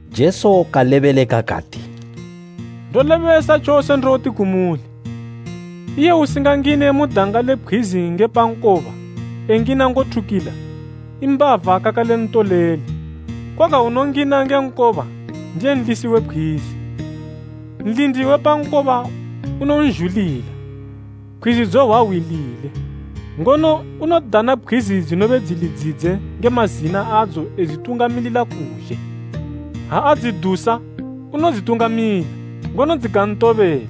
Jesu kalebeleka kati, “Ndolebesa tjose ndoti kumuli, iye usingangine mu danga le pkhwizi nge pa nkoba, engina ngothukila, i mbava kakale ntoleli, koga unongina nge nkoba ndiye nlisi we pkhwizi. Nlindi we pa nkoba unonzhulila, pkhwizi dzohwa hwi lile. Ngono unodana pkhwizi dzinobe dzili dzidze nge mazina adzo edzitungamilila kuzhe. Ha adzidusa, unodzitungamila, ngono dzikantobela,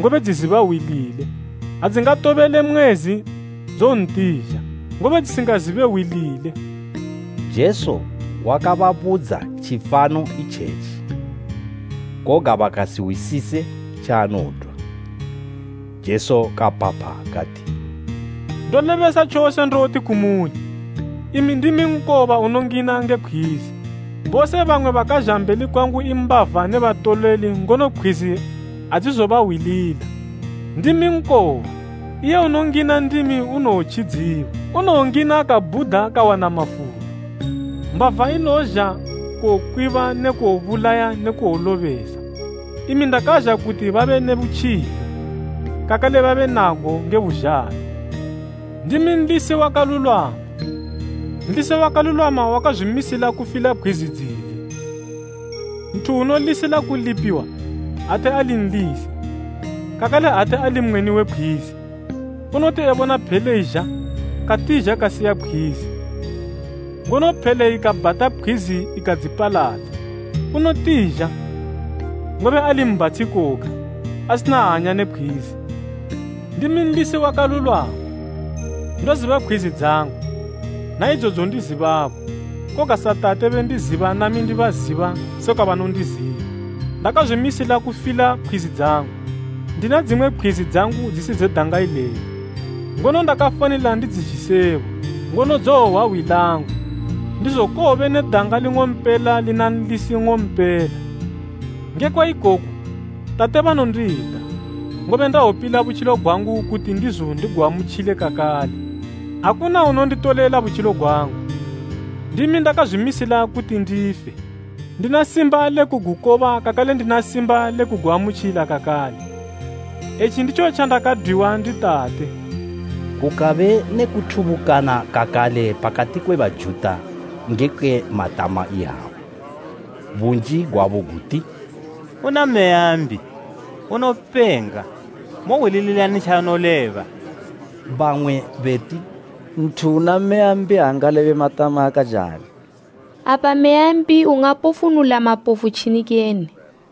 ngobe dziziba hwi lile. Adzingatobele mwezi, dzowontizha, ngobe dzisingazibe hwi lile.” Jesu wakababudza tjifano itjetji, koga bakasihwisise tjaanodwa. Jesu kapapha kati, “Ndolebesa tjose ndoti kumuli, imi ndimi nkoba unongina nge pkhwizi. Bose bamwe bakazha mbeli kwangu i mbava ne batoleli ngono pkhwizi adzizobahwilila. Ndimi nkoba. Iye unongina ndimi unowotjidziwa, unowongina kabhuda kawana mafulo. Mbava inozha kuwokwiba ne kuwobulaya ne kuwolobesa. Imi ndakazha kuti babe ne butjilo, kakale babe nago nge buzhalo. “Ndimi nlisi wakalulwama. Nlisi wakalulwama wakazwimisila kufila pkhwizi dzidze. Nthu unolisila kulipiwa, ate ali nlisi, kakale ate ali mweni we pkhwizi, unoti ebona phele izha, katizha kasiya pkhwizi, ngono phele ikabhata pkhwizi ikadzipaladza. Unotizha, ngobe ali mbhatshi koga, asina hanya ne pkhwizi. Ndimi nlisi wakalulwama, ndoziba pkhwizi dzangu, na idzo dzondizibabo, koga sa Tate bendiziba nami ndibaziba sekwa banondiziba. Ndakazwimisila kufila pkhwizi dzangu. Ndina dzimwe pkhwizi dzangu dzisi dze danga ileli. Ngono ndakafanila ndidzizhisebo, ngono dzowohwa hwi langu, ndizo kowobe ne danga ling'ompela lina nlisi nng'ompela. “Ngekwa ikoku, tate banondida, ngobe ndawopila butjilo gwangu kuti ndizo ndiguamutjile kakale. Akuna unonditolela butjilo gwangu. Ndimi ndakazwimisila kuti ndife. Ndina simba le kugukoba kakale ndina simba le kuguamutjila kakale. Etji nditjo tjandakadwiwa ndi Tate.” Kukabe ne kuthubukana kakale pakati kwe Bajuta ngekwe matama iyawa. Bunji gwabo guti, “Una meya mbi! Unopenga! Mohwilililani tjaanoleba?” Bamwe beti, “Nthu una meya mbi aangalebe matama akajali. Apa meya mbi ingapofunula mapofu tjini kene?”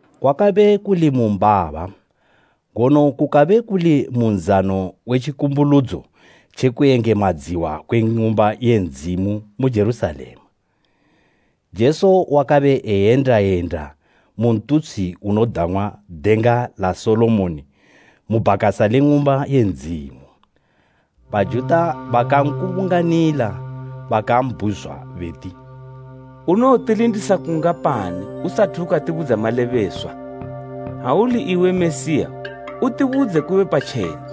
Kwakabe kuli mu mbaba, ngono kukabe kuli mu nzano we tjikumbuludzo tje kuyengemadziwa kwe Ng'umba ye Ndzimu mu Jerusalema. Jesu wakabe eyenda yenda mu ntutshi unodang'wa Denga la Solomoni mu bhakasa le Ng'umba ye Ndzimu. Bajuta bakankubunganila bakambhuzwa beti, “Unowotilindisa kungapani usathu ukatibudza malebeswa? Ha uli iwe Mesiya, utibudze kube patjena.”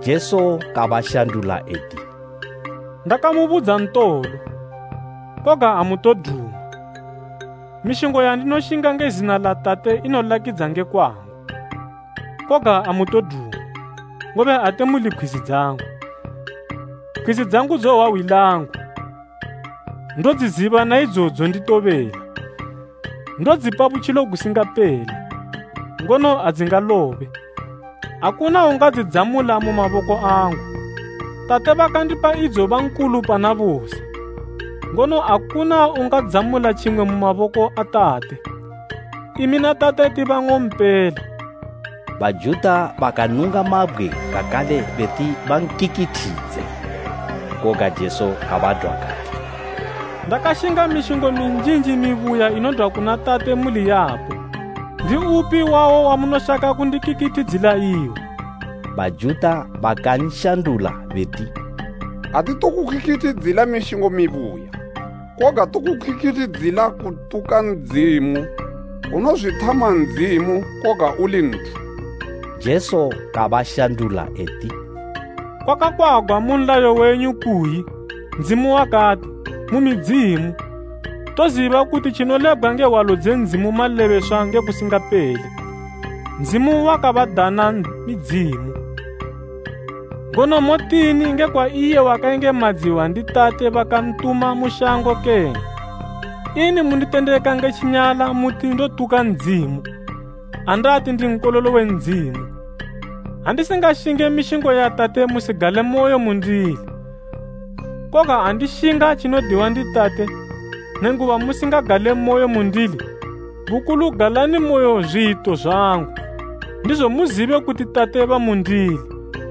Jesu kabashandula eti, “Ndakamubudza ntolo, koga amutoduma. Mishingo yandinoshinga nge zina la Tate inolakidza nge kwangu, koga amutoduma, ngobe ate muli pkhwizi dzangu. Pkhwizi dzangu dzohwa hwi langu, ndodziziba na idzo dzonditobela. Ndodzipa butjilo gusingapele, ngono adzingalobe. Akuna ungadzidzamula mu maboko angu. Tate bakandipa idzo ba nkulu pana bose, ngono akuna ungadzamula tjimwe mu maboko a Tate. Imi na Tate ti banng'ompela.” Bajuta bakanunga mabgwe kakale beti bankikithidze. Koga Jesu kabadwa kati, “Ndakashinga mishingo minjinji mibuya inodwa kuna Tate muli yapo, ndiupi wayo wamunoshaka kundikikithidzila iwo?” Bajuta bakanshandula beti, “Atitokukikithidzilila mishingo mibuya, koga tokukikithidzilila kutuka Ndzimu! Unozwithama Ndzimu koga uli nthu!” Jesu kabashandula eti, “Kwakakwagwa mu nlayo wenyu kuyi Ndzimu wakati, ‘Mu midzimu.’ Toziba kuti tjinolebgwa nge Hwalo dze Ndzimu malebeswa nge kusingapele, Ndzimu wakabadana midzimu, ngono motini nge kwa iye wakayengemadziwa ndi Tate bakantuma mu shango kene? Ini munditendeka nge tjinyala muti ndotuka Ndzimu andati ndi Nkololo we Ndzimu? Ha ndisingashinge mishingo ya Tate musigalemoyo mundili. Koga ha ndishinga tjinodiwa ndi Tate, nenguba musingagalemoyo mundili, bukulu galanimoyo zwiyito zwangu, ndizo muzibe kuti Tate bamundili,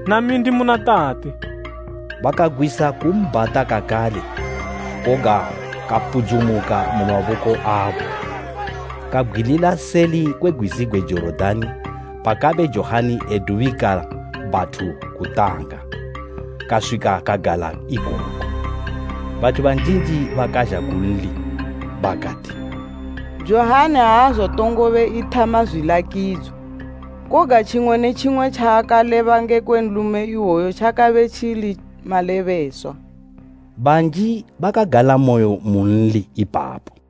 nami ndimuna Tate.” Bakagwisa kumbhata kakale, koga kapudzumuka mu maboko abo. Kabgwilila seli kwe gwizi gwe Jorodani pakabe Johani e dubikila bathu kutanga, kaswika kagala ikoko. Bathu banjinji bakazha kunli. Bakati, “Johani aazotongobe ethama zwilakidzo, koga tjimwe ne tjimwe tjaakaleba ngekwe nlume iwoyu tjakabe tjili malebeswa.” Banji bakagalamoyo munli ipapo.